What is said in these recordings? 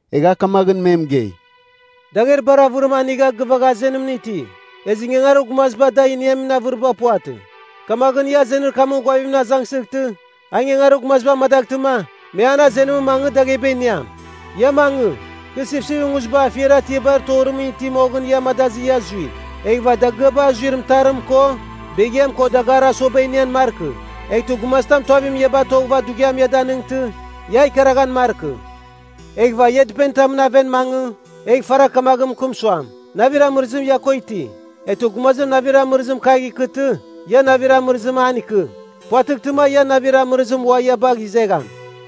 Egha a kamaghɨn me mɨgei, “Dagher bar avɨrim anigha gɨvagha azenimɨn iti. Ezɨ ingangarir gumazir da iniamin avɨriba puvatɨ. Kamaghɨn, ia azenir kamɨn ghuavimɨn azangsɨghtɨ, a ingangarir gumaziba amangtɨma, me an azenimɨn mangɨ, dagheba iniam. Ia mangɨ! Kɨ sipsipɨn nguziba afiar atiabar torimɨn iti moghɨn ia amadazɨ ia zui. Eghɨva dagɨaba azuir mɨtarim ko beghiam ko dagarir asuaba inian markɨ. Eghtɨ gumazitam tuavimɨn ia batoghɨva dughiam ia danɨngtɨ, ia ikaraghan markɨ. “Eghɨva ia dɨpenitamɨn aven mangɨ egh faragh kamaghɨn mɨkɨm suam, navir amɨrɨzim ia ko iti. Eghtɨ gumazir navir amɨrɨzim kagh ikɨtɨ, ia navir amɨrɨzim an ikɨ. puvatɨghtɨma ian navir amɨrɨzim ua ia bagh izegham.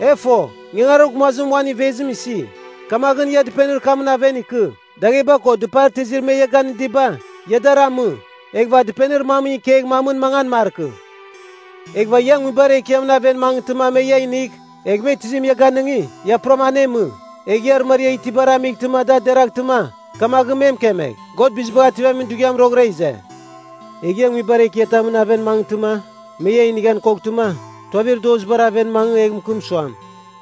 E fo, ingangarir gumazim uan ivezim isi, kamaghɨn ia dɨpenir kamɨn aven ikɨ, dagheba ko dɨpar tizir me ia ganɨdiba, ia dar amɨ. Eghɨva dɨpenir mamɨn ikegh mamɨn mangan markɨ. “Eghɨva ia nguibar ekiamɨn aven mangɨghtɨma me ia inigh, egh me tizim ia ganɨngi, ia puram anemɨ. Egh ia arɨmariar itibar amightɨma da deraghtɨma, kamaghɨn me mɨkemegh, God Bizibagh Ativamin Dughiam roghɨra ize. Egh ia nguibar ekiatamɨn aven mangɨtɨma, me ia inighan koghtɨma, tuavir dozibar aven mangɨ egh mɨkɨm suam,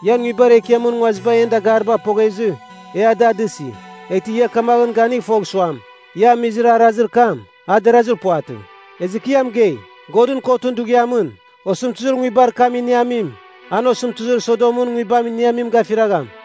‘Ian nguibar ekiamɨn nguaziba en dagaribar poghezɨ, e a da dɨsi, eghtɨ ia kamaghɨn ganigh fogh suam, ia amizir arazir kam, a derazir puvatɨ.’ Ezɨ kɨ ia mɨgei, Godɨn Kotɨn Dughiamɨn, osɨmtɨzir nguibar kam iniamim, an osɨmtɨzir Sodomɨn nguibam iniamim gafiragham.”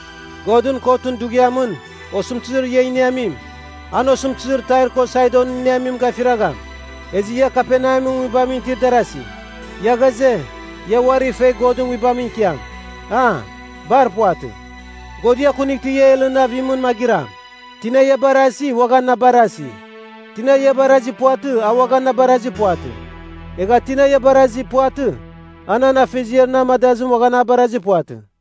Godɨn Kotɨn Dughiamɨn, osɨmtɨzir ia iniamim, an osɨmtɨzir Tair ko Saidon iniamim gafiragham. Ezɨ ia Kaperneamɨn nguibamɨn itir darazi, ia ghaze, ia uari fegh Godɨn Nguibamɨn ikiam, a? Bar puvatɨ, God ia akunightɨ ia Helɨn avimɨn magɨram. “Tina ia barasi uaghan na barasi, tina ia barazir puvatɨ a uaghan na barazir puvatɨ. Egha tina na barazir puvatɨ, a nan Afeziar na amadazim uaghan a barazir puvatɨ.”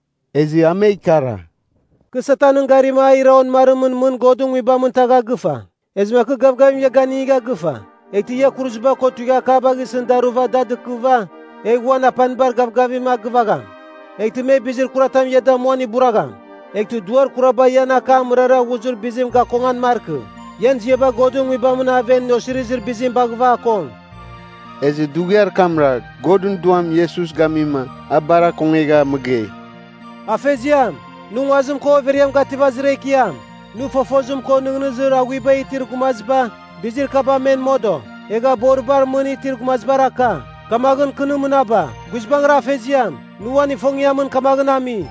Ezɨ a me ikara, “Kɨ Satanɨn garima a ira onɨmarimɨn mɨn Godɨn nguibamɨn tagha gɨfa. Ezɨma kɨ gavgavim ia ganigha gɨfa eghtɨ ia kuruziba ko tuighiakaba gisɨn daruva da dɨkɨva, egh uan apanibar gavgavim a gɨvagham. Eghtɨ me bizir kuratam ia damuan iburagham. Eghtɨ duar kuraba ian akam mɨrara ghuzir bizim gakongan markɨ. Ian ziaba Godɨn Nguibamɨn aven osirizir bizim baghɨva akong.” Ezɨ dughiar kamra, Godɨn Duam Iesus gamima a bar akongeghava mɨgei, “Afeziam, nɨ nguazim ko overiam gativazir Ekiam! Nɨ fofozim ko nɨghnɨzir aghuiba itir gumaziba bizir kaba men modo, egha boribar mɨn itir gumazibar aka. Kamaghɨn kɨ nɨ mɨnaba. Guizbangɨra Afeziam, nɨ uan ifongiamɨn kamaghɨn ami.”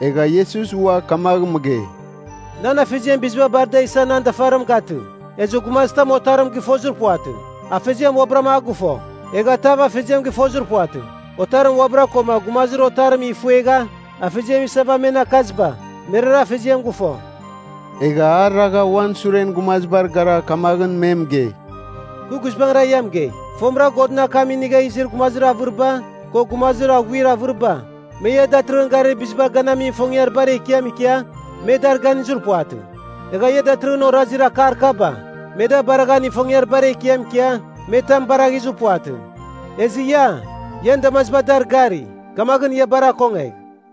Egha Iesus ua kamagh mɨgei, “Nan Afeziam biziba bar da isa nan dafarim gatɨ. Ezɨ gumazitam Otarim gɨfozir puvatɨ. Afeziam uabɨra a gɨfo. Egha tav Afeziam gɨfozir puvatɨ. Otarim uabɨra, koma gumazir Otarim ifuegha Afeziam isava men akaziba, merara Afeziam gɨfo.” Egha a ragha uan suren gumazibar gara kamaghɨn me mɨgei, “Kɨ guizbangɨra ia mɨgei, fomɨra Godɨn akam inigha izir gumazir avɨriba ko gumazir aghuir avɨriba, me ia datɨrɨghɨn garir bizibar ganamin ifongiar bar ekiam ikia, me dar ganizir puvatɨ. Egha ia datɨrɨghɨn orazir akar kaba, me da baraghan ifongiar bar ekiam ikia, me tam baraghizir puvatɨ. Ezɨ ia, ian damaziba dar gari, kamaghɨn ia bar akongegh!”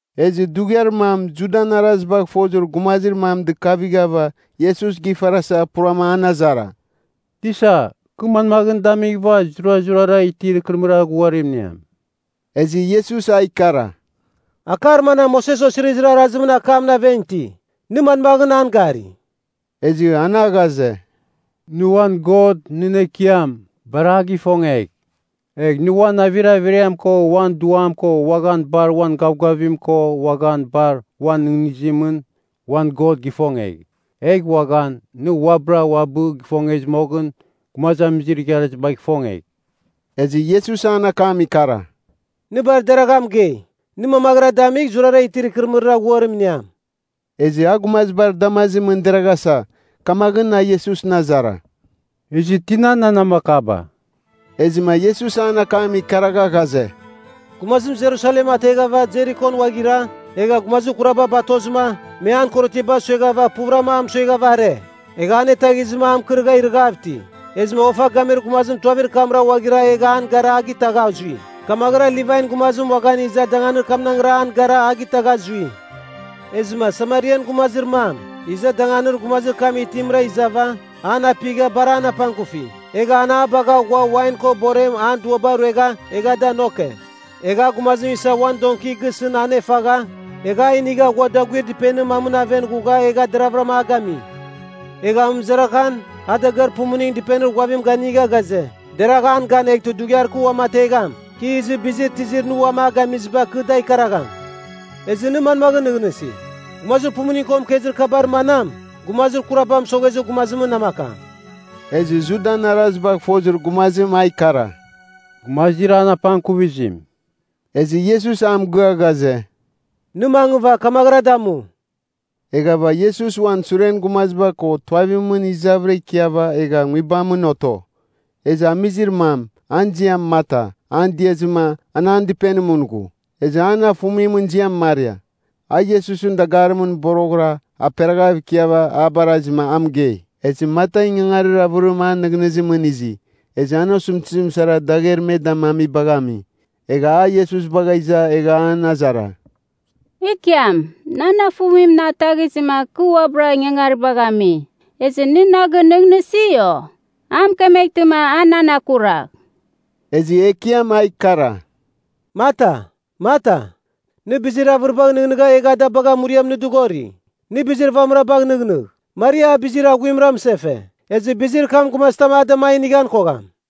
Ezɨ dughiar mam Judan arazibagh fozir gumazir mam dɨkavighava Iesus gifarasa purama an azara, “Tisa, kɨ manmaghɨn damighɨva zurazurara itir ikɨrɨmɨrir aghuarim iniam?” Ezɨ Iesus a ikara, “Akar manam Moses Osirizir Arazimɨn akamɨn aven iti? Nɨ manmaghɨn an gari?” Ezɨ an a ghaze, “Nɨ uan God, nɨn Ekiam, bar a gifongegh, egh nɨ uan navir averiam ko uan duam ko uaghan bar uan gavgavim ko uaghan bar uan nɨghnɨzimɨn, uan God gifongegh. Egh uaghan, nɨ uabɨra uabɨ gifongezɨ moghɨn, gumazamizir igharazibagh ifongegh.” Ezɨ Iesus an akam ikara, “Nɨ bar deragha mɨgei. Nɨ mamaghɨra damigh, zurara itir ikɨrɨmɨrir aghuarim iniam.” Ezɨ a gumazibar damazimɨn deraghasa, kamaghɨn a Iesusɨn azara, “Ezɨ tina nan namakaba?” Ezɨma Iesus an akam ikaragha ghaze, “Gumazim Jerusalem ateghava Jerikon uaghira, egha gumazir kuraba batozɨma, me an korotiaba sueghava, puvɨram a mɨsueghava are, egha anetaghizɨma a mɨkɨrɨgha irɨghav iti. Ezɨma ofa gamir gumazim tuavir kamra uaghira egha an gara a gitagha zui. Kamaghɨra Livain gumazim uaghan iza danganir kamnaghra an gara a gitagha zui. Ezɨma Samarian gumazir mam, iza danganir gumazir kam itimra izava, an apighava bar an apangkufi. Egha an a bagha ghua wain ko borem an duaba ruegha egha da nomke. Egha a gumazim isa uan donki gisɨn anefagha, egha a inigha ghua daguir dɨpenir mamɨn aven ghugha egha deravɨram a gami. Egha amɨmɨzaraghan a dagɨar pumuning dɨpenir ghuavim ganigha ghaze, ‘Deragh an gan eghtɨ dughiar kɨ uamategham, kɨ izɨ bizir tizir nɨ uam a gamiziba kɨ da ikaragham.’ “Ezɨ nɨ manmaghɨn nɨghnɨsi, gumazir pumuning ko mɨkezir kabar manam gumazir kuraba mɨsoghezir gumazimɨn namakam?” Ezɨ Judan arazibagh fozir gumazim a ikara, “Gumazir an apangkuvizim.” Ezɨ Iesus a mɨgɨa ghaze, “Nɨ mangɨva kamaghɨra damu.” Eghava Iesus uan suren gumaziba ko tuavimɨn izavɨra ikiava egha nguibamɨn oto. Ezɨ amizir mam, an ziam Marta an diazɨma an an dɨpenimɨn ghu. Ezɨ an afumimɨn ziam Maria. A Iesusɨn dagarimɨn boroghɨra aperaghav ikiava a barazima a mɨgei. Ezɨ Marta ingangarir avɨrim an nɨghnɨzimɨn izi, ezɨ an osɨmtɨzim sara dagher me damamibagh ami. Egha a Iesus bagha iza egha an azara, “Ekiam, nan afumim na ataghizɨma kɨ uabɨra ingangaribagh ami, ezɨ nɨ na gɨnɨghnɨsi, o? A mɨkemeghtɨma a nan akuragh!” Ezɨ Ekiam a ikara, “Marta, Marta, nɨ bizir avɨribagh nɨghnɨgha egha da bagha muriam nɨ dɨghori. Nɨ bizir vamɨra bagh nɨghnɨgh. Maria a bizir aghuimra mɨsefe. Ezɨ bizir kam gumazitam a dama a inigham kogham.”